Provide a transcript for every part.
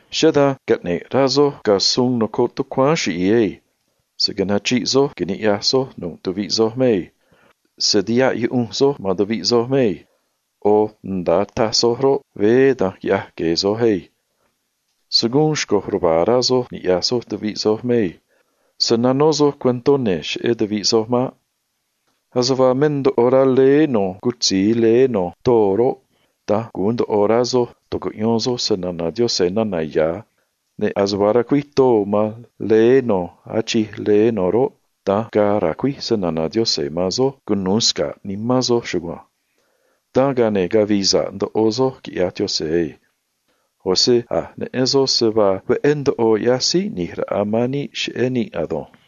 Cheꞌé dan caꞌne̱ꞌ rá soj ga̱ suun nocoꞌ tucuáán chiꞌi̱i̱ ei. Se̱ nachriꞌ soj ni̱ꞌyaj soj nu̱ꞌ tuviꞌ soj mei. Se̱ tihaꞌ yuꞌunj soj man tuviꞌ soj mei. ꞌO̱ nda̱a taj soj roꞌ, veé da̱nj quiꞌya̱j gue̱e̱ soj ei. Se̱ guun xco̱j ruva̱a̱ rá soj ni̱ꞌyaj soj tuviꞌ soj mei. Se̱ nanó soj cuentó ne̱ cheꞌé tuviꞌ soj maꞌ. Ase vaa me ndoꞌo rá leé no̱ cutzi̱i leé no̱ too roꞌ, da̱nj gu̱un ndoꞌo rá soj tu̱cuꞌyón soj se‑na̱na̱ Diose̱ nana̱ ya̱, ne̱ ase vaa racuíj too man leé no̱ achij leé no̱ roꞌ, da̱nj ga̱a̱ ra̱cuíj se‑na̱na̱ Diose̱ man soj cunu̱u sca̱ꞌ nimán soj chugua̱nj. Dan, ga̱a ne̱ cavi̱i̱ sa̱ꞌ ndoꞌo soj, quiꞌya̱j Diose̱ ei. ꞌO̱ se a̱j neꞌen soj se vaa veꞌé ndoꞌo ꞌyaj síí ꞌni̱j raꞌa man níꞌ cheꞌé níꞌ ado̱nj.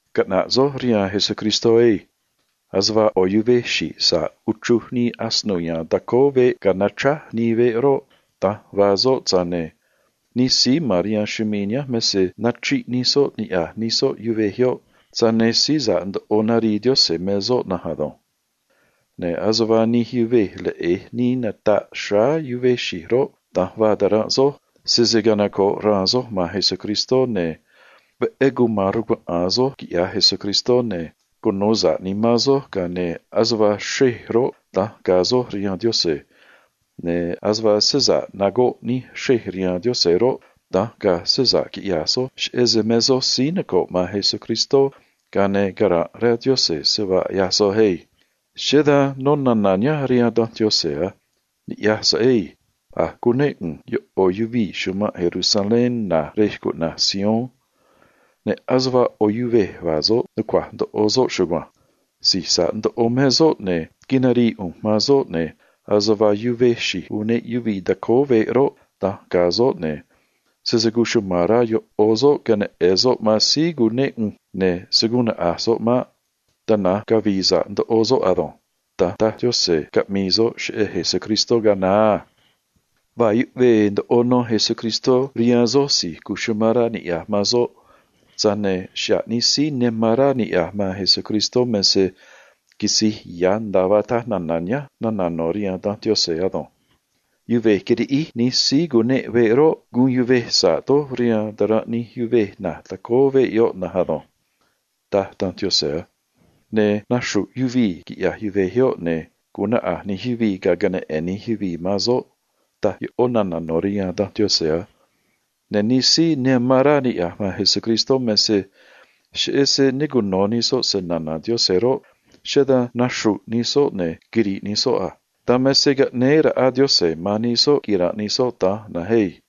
Caꞌna̱ꞌ soj rihaan Jesucristó ei. Ase vaa ꞌo̱ yuvej xi̱j sa̱ꞌ uchruj nii asino ya̱a̱n tacóó veꞌ ga̱a nachráj nii veꞌ roꞌ, da̱nj vaa soꞌ, tza̱j ne̱ nij síí ma̱n rihaan chumii̱ nihánj me se nachriꞌ nij soꞌ niꞌya̱j nij soꞌ yuvej yoꞌ, tza̱j ne̱ síí sa̱ꞌ ndoꞌo narii Diose̱ me soꞌ na̱nj ado̱nj. Ne̱ ase vaa nij yuvej leꞌe̱j nii nataꞌ xráá yuvej xi̱j roꞌ, da̱nj vaa taranꞌ soj, sese canoco̱ꞌ raan soj man Jesucristó, ne̱ veꞌé cuma̱n rcuaꞌa̱a̱n soj, quiꞌya̱j Jesucristó, ga̱a ne̱ cunu̱u sa̱ꞌ nimán soj, ga̱a ne̱ ase vaa xrej roꞌ, da̱nj ga̱a̱ soj rihaan Diose̱, ne̱ ase vaa se sa̱ꞌ nagoꞌ nij xrej rihaan Diose̱ roꞌ, da̱nj ga̱a̱ se sa̱ꞌ quiꞌya̱j soj cheꞌé se me soj síí noco̱ꞌ man Jesucristó, ga̱a ne̱ cara̱nꞌ rá Diose̱ se vaa ꞌyaj soj ei. Cheꞌé dan nó nana̱ nihánj rihaan danj Diose̱ a: “Ni̱ꞌyaj so̱ꞌ ei. A̱j cunéꞌ ꞌu̱nj yoꞌo̱ yuvii̱ chumanꞌ Jerusalén na̱j rej cuꞌna̱j Sion, ne̱ ase vaa ꞌo̱ yuvej vaa soꞌ, nucua̱j ndoꞌo soꞌ chugua̱nj. Si̱j sa̱ꞌ ndoꞌo me soꞌ, ne̱ quinarii ꞌu̱nj man soꞌ, ne̱ ase vaa yuvej xi̱j uneꞌ yuvii̱ tacóó veꞌ roꞌ, da̱nj ga̱a̱ soꞌ, ne̱ sese cuchuma̱n rá yoꞌo̱ soꞌ queneꞌe̱n soꞌ man síí cunéꞌ ꞌu̱nj, ne̱ se̱ guun naꞌa̱j soꞌ maꞌ. Tana̱nj cavi̱i̱ sa̱ꞌ ndoꞌo soꞌ ado̱nj”. Da̱nj cataj Diose̱, caꞌmii soꞌ cheꞌé Jesucristó ga̱a naá a. Vaa yuꞌvee ndoꞌo nó Jesucristó rihaan soj si̱j amán rá niꞌya̱j man soꞌ, tza̱j ne̱ xa̱ꞌ nij síí ne amán rá niꞌya̱j man Jesucristó me se quisi̱j ya̱ nda̱a vaa taj nana̱ nihánj nana̱ no̱ rihaan danj Diose̱ ado̱nj: “Yuvej quiriꞌíj nij síí cuneꞌ veꞌ roꞌ, guun yuvej sa̱ꞌ doj rihaan taranꞌ nij yuvej na̱j tacóó veꞌ yoꞌ na̱nj ado̱nj”, taj danj Diose̱ a. Ne̱: “Naxru̱ꞌ yuvii̱, quiꞌya̱j yuvej yoꞌ, ne̱ gu̱un naꞌa̱j nij yuvii̱ ga̱a queneꞌe̱n nij yuvii̱ man soꞌ”, taj yoꞌó nana̱ no̱ rihaan danj Diose̱ a. Ne̱ nij síí ne amán rá niꞌya̱j man Jesucristó me se cheꞌé se ne cuno̱ nij soꞌ se‑na̱na̱ Diose̱ roꞌ, cheꞌé dan naxru̱ꞌ nij soꞌ ne̱ quiri̱ꞌ nij soꞌ a. Dan me se caꞌnéé raꞌa Diose̱ man nij soꞌ quira̱nꞌ nij soꞌ da̱nj na̱nj ei.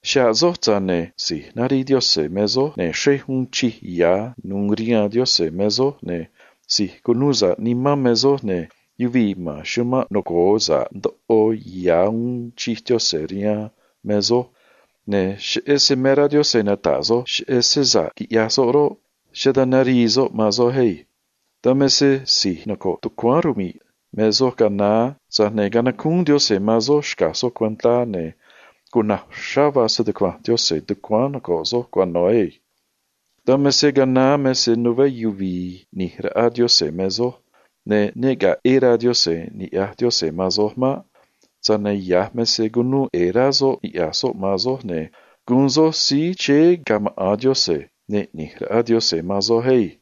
Xa̱ꞌ soj, tza̱j ne̱ si̱j narii Diose̱ me soj, ne̱ xrej uun chij ya̱ nu̱u̱ rihaan Diose̱ me soj, ne̱ si̱j cunuu sa̱ꞌ nimán me soj, ne̱ yuvii̱ ma̱n chumanꞌ noco̱o sa̱ꞌ ndoꞌo ya̱ uun chij Diose̱ rihaan me soj, ne̱ cheꞌé se me rá Diose̱ nata̱ꞌ soj cheꞌé se sa̱ꞌ quiꞌyaj soꞌ roꞌ, cheꞌé dan narii soꞌ man soj ei. Dan me se si̱j noco̱ꞌ tucuáán rmi̱ꞌ me soj ga̱a naá, tza̱j ne̱ canacúún Diose̱ man soj xca̱j soj cuentá, ne̱ cuna̱j uxrá vaa se‑tucua̱nj Diose̱ tucuáán noco̱ꞌ soj cuano̱ ei. Dan me se ga̱a naá me se nuveé yuvi̱i̱ ꞌni̱j raꞌa Diose̱ me soj, ne̱ ne ga̱a̱ ꞌe̱e̱ rá Diose̱ ni̱ꞌyaj Diose̱ man soj maꞌ. Tza̱j ne̱ ya̱j me se cunuu ꞌe̱e̱ rá soꞌ niꞌya̱j soꞌ man soj, ne̱ guun soj síí chéé ga̱ maꞌa̱n Diose̱, ne̱ ꞌni̱j raꞌa Diose̱ man soj ei.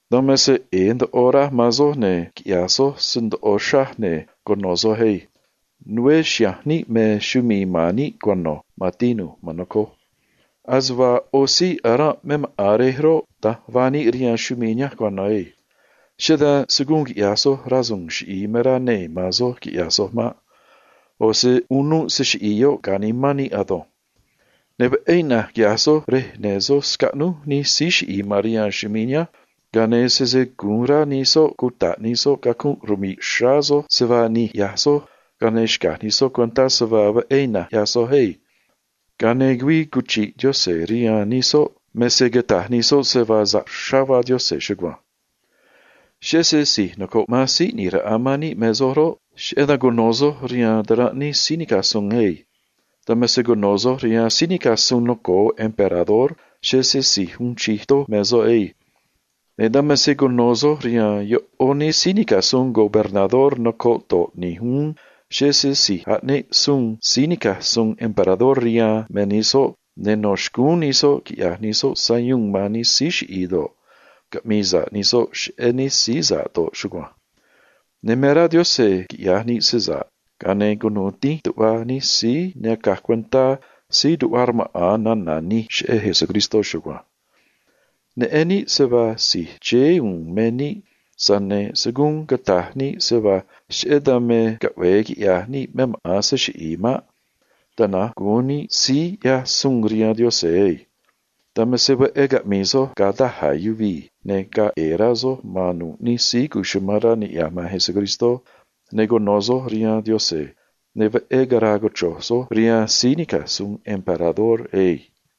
Dan me se ꞌe̱e̱ ndoꞌo raj man soj, ne̱ quiꞌya̱j soj se ndoꞌo uxrá, ne̱ cuno̱ soj ei. Nuveé chiha̱nj níꞌ me chumii̱ ma̱n níꞌ cuano̱, man tinu̱j, man nocoj. Ase vaa ꞌo̱ síí aranꞌ me maꞌa̱n rej roꞌ, da̱nj vaa níꞌ rihaan chumii̱ nihánj cuano̱ ei. Cheꞌé dan se̱ guun quiꞌya̱j soj rasu̱u̱n chiꞌi̱i̱ me rá nee̱ man soj quiꞌya̱j soj maꞌ. ꞌO̱ se unuꞌ se chiꞌi̱i̱ yoꞌ ga̱ nimán níꞌ ado̱nj. Ne̱ veꞌé ina̱nj quiꞌya̱j soj rej ne̱ soj scaꞌnúj nij síí chiꞌi̱i̱ ma̱n rihaan chumii̱ nihánj, ga̱a ne̱ sese gu̱un rá nij soꞌ cuta̱ꞌ nij soꞌ cacunꞌ rmi̱ꞌ xráá soj se vaa nij ꞌyaj soj, ga̱a ne̱ xca̱j nij soꞌ cuentá se vaa veꞌé ina̱nj ꞌyaj soj ei. Ga̱a ne̱ güii cuchi̱ꞌ Diose̱ rihaan nij soꞌ me se cata̱j nij soꞌ se vaa sa̱ꞌ uxrá vaa Diose̱ chugua̱nj. Cheꞌé se si̱j noco̱ꞌ man síí ꞌni̱j raꞌa man níꞌ me soj roꞌ, cheꞌé dan cuno̱ soj rihaan taranꞌ nij síí nica̱j suun ei. Dan me se cuno̱ soj rihaan síí nica̱j suun noco̱o emperador, cheꞌé se si̱j uun chij doj me soꞌ ei. Ne̱ dan me se cuno̱ soj rihaan yoꞌó nij síí nica̱j suun gobernador noco̱ꞌ do̱ꞌ ni̱j uún, cheꞌé se si̱j aꞌneꞌ suun síí nica̱j suun emperador rihaan me nij soꞌ, ne̱ no̱ xcúún nij soꞌ quiꞌya̱j nij soꞌ sayuun man nij síí chiꞌi̱i̱ do̱ꞌ, caꞌmi̱i̱ sa̱ꞌ nij soꞌ cheꞌé nij síí sa̱ꞌ do̱ꞌ chugua̱nj. Ne̱ me rá Diose̱ quiꞌya̱j níꞌ se sa̱ꞌ, ga̱a ne̱ cunu̱u dínj tuꞌva nij síí ne acaj cuentá síí tuꞌva rmaꞌa̱n nana̱ nij cheꞌé Jesucristó chugua̱nj. Neꞌen níꞌ se vaa si̱j chéé u̱u̱n me níꞌ, tza̱j ne̱ se̱ guun cata̱j níꞌ se vaa cheꞌé dan me caꞌve̱e quiꞌya̱j níꞌ me maꞌa̱n se chiꞌi̱i̱ maꞌ. Tana̱nj gu̱un níꞌ síí ꞌyaj suun rihaan Diose̱ ei. Dan me se veꞌé caꞌmi̱i̱ soj ga̱ daj a̱ yuvii̱, ne̱ ga̱a̱ ꞌe̱e̱ rá soj man nu̱ꞌ nij síí amán rá niꞌya̱j man Jesucristó, ne̱ cuno̱ soj rihaan Diose̱, ne̱ veꞌé cara̱a̱ cochro̱j soj rihaan síí nica̱j suun emperador ei.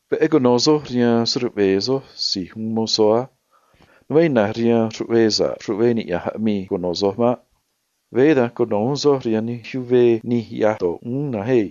Veꞌé cuno̱ soj rihaan se‑ruꞌve̱e̱ soj si̱j uun mozó á. Nuveé ina̱nj rihaan nij ruꞌvee sa̱ꞌ ruꞌvee niꞌya̱nj aꞌmii cuno̱ soj maꞌ. Veé da̱nj cuno̱ uún soj rihaan nij ruꞌvee nij ꞌyaj do̱ꞌ uún na̱nj ei.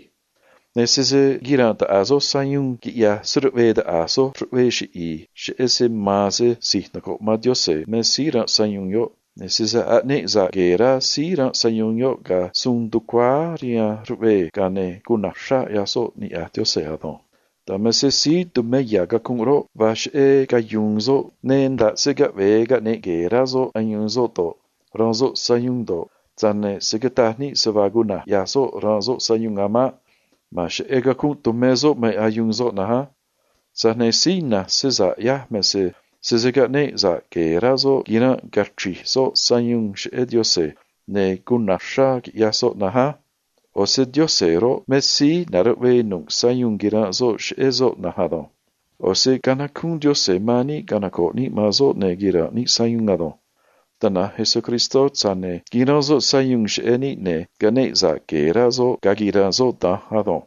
Ne̱ sese quira̱nꞌ taꞌa̱j soj sayuun quiꞌya̱j se‑ruꞌve̱e̱ taꞌa̱j soj ruꞌvee chiꞌi̱i̱, cheꞌé se ma̱a̱n se si̱j noco̱ꞌ man Diose̱ me síí ranꞌ sayuun yoꞌ, ne̱ sese aꞌneꞌ sa̱ꞌ gue̱e̱ rá síí ranꞌ sayuun yoꞌ ga̱ suun tucuáá rihaan ruꞌvee, ga̱a ne̱ cuna̱j uxrá ꞌyaj soꞌ niꞌya̱j Diose̱ ado̱nj. Dan me se síí tumé ya̱ cacunꞌ roꞌ, vaa cheꞌé cayu̱u̱n soꞌ, ne̱ nda̱ꞌ se caꞌve̱e caꞌne̱ꞌ gue̱e̱ rá soꞌ ayuun soꞌ do̱ꞌ, ranꞌ soꞌ sayuun do̱ꞌ, tza̱j ne̱ se̱ cataj níꞌ se vaa cuna̱j ꞌyaj soꞌ ranꞌ soꞌ sayuun a̱ maꞌ. Ma̱a̱n cheꞌé cacunꞌ tumé soꞌ me ayuun soꞌ na̱nj á. Tza̱j ne̱ síí ina̱nj se sa̱ꞌ ꞌyaj me se sese caꞌneꞌ sa̱ꞌ gue̱e̱ rá soꞌ quiranꞌ cachri̱j soꞌ sayuun cheꞌé Diose̱, ne̱ cuna̱j uxrá quiꞌyaj soꞌ na̱nj á. ꞌO̱ se Diose̱ roꞌ, me síí na̱ruꞌvee nu̱ꞌ sayuun quiranꞌ soꞌ cheꞌé soꞌ na̱nj ado̱nj. ꞌO̱ se canacúún Diose̱ man níꞌ canoco̱ꞌ níꞌ man soꞌ ne̱ quira̱nꞌ níꞌ sayuun ado̱nj. Tana̱nj Jesucristó, tza̱j ne̱ quiranꞌ soꞌ sayuun cheꞌé níꞌ, ne̱ caꞌneꞌ sa̱ꞌ gue̱e̱ rá soꞌ ga̱a quiranꞌ soꞌ da̱nj ado̱nj.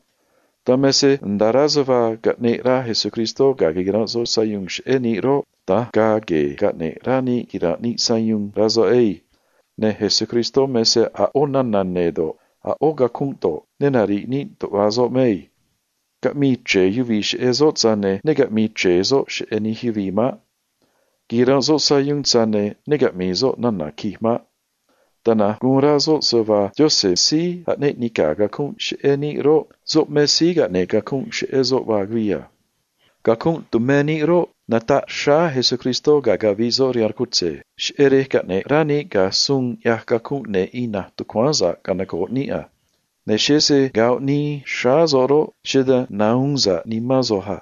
Dan me se nda̱a rá se vaa caꞌneꞌ rá Jesucristó ga̱a quiranꞌ soꞌ sayuun cheꞌé níꞌ roꞌ, da̱nj ga̱a̱ gue̱e̱ caꞌne̱ꞌ rá níꞌ quira̱nꞌ níꞌ sayuun, rá soꞌ ei. Ne̱ Jesucristó me se a̱ ꞌó nana̱ ne̱ do̱ꞌ, a̱ ꞌó cacunꞌ do̱ꞌ, ne nari̱ꞌ níꞌ tuꞌva soꞌ mei. Caꞌmii chre̱e yuvii̱ cheꞌé soꞌ, tza̱j ne̱ ne caꞌmi̱i̱ chre̱e soꞌ cheꞌé nij yuvii̱ maꞌ. Quiranꞌ soꞌ sayuun, tza̱j ne̱ ne caꞌmi̱i̱ soꞌ nana̱ quij maꞌ. Tana̱nj guun rá soꞌ se vaa Diose̱ síí aꞌneꞌ nica̱ cacunꞌ cheꞌé níꞌ roꞌ, soꞌ me síí caꞌne̱ꞌ cacunꞌ cheꞌé soꞌ vaa güii a. Cacunꞌ tumé níꞌ roꞌ, nataꞌ xráá Jesucristó ga̱a caviꞌ soꞌ rihaan rcutze̱, cheꞌé rej caꞌne̱ꞌ rá níꞌ ga̱ suun ꞌyaj cacunꞌ ne̱ ina̱nj tucuáán sa̱ꞌ canoco̱ꞌ níꞌ a. Ne̱ cheꞌé se goꞌ nii xráá soꞌ roꞌ, cheꞌé dan nahuun sa̱ꞌ nimán soj a.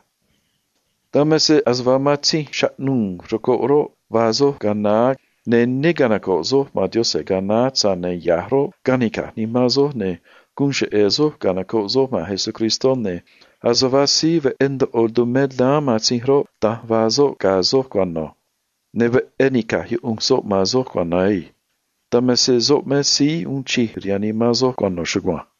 Dan me se ase vaa matzinj chaꞌnuu̱ rcoꞌ roꞌ, vaa soj ga̱a naá, ne̱ ne canoco̱ꞌ soj man Diose̱ ga̱a naá, tza̱j ne̱ ya̱j roꞌ, canica̱j nimán soj, ne̱ guun cheꞌe̱ soj canocoꞌ soj man Jesucristó, ne̱ ase vaa síí veꞌé ndoꞌo tumé daán matzinj roꞌ, da̱nj vaa soꞌ ga̱ soj cuano̱, ne̱ veꞌé nica̱j yuꞌunj soꞌ man soj cuano̱ ei. Dan me se soꞌ me síí uun chij rihaan nimán soj cuano̱ chugua̱nj.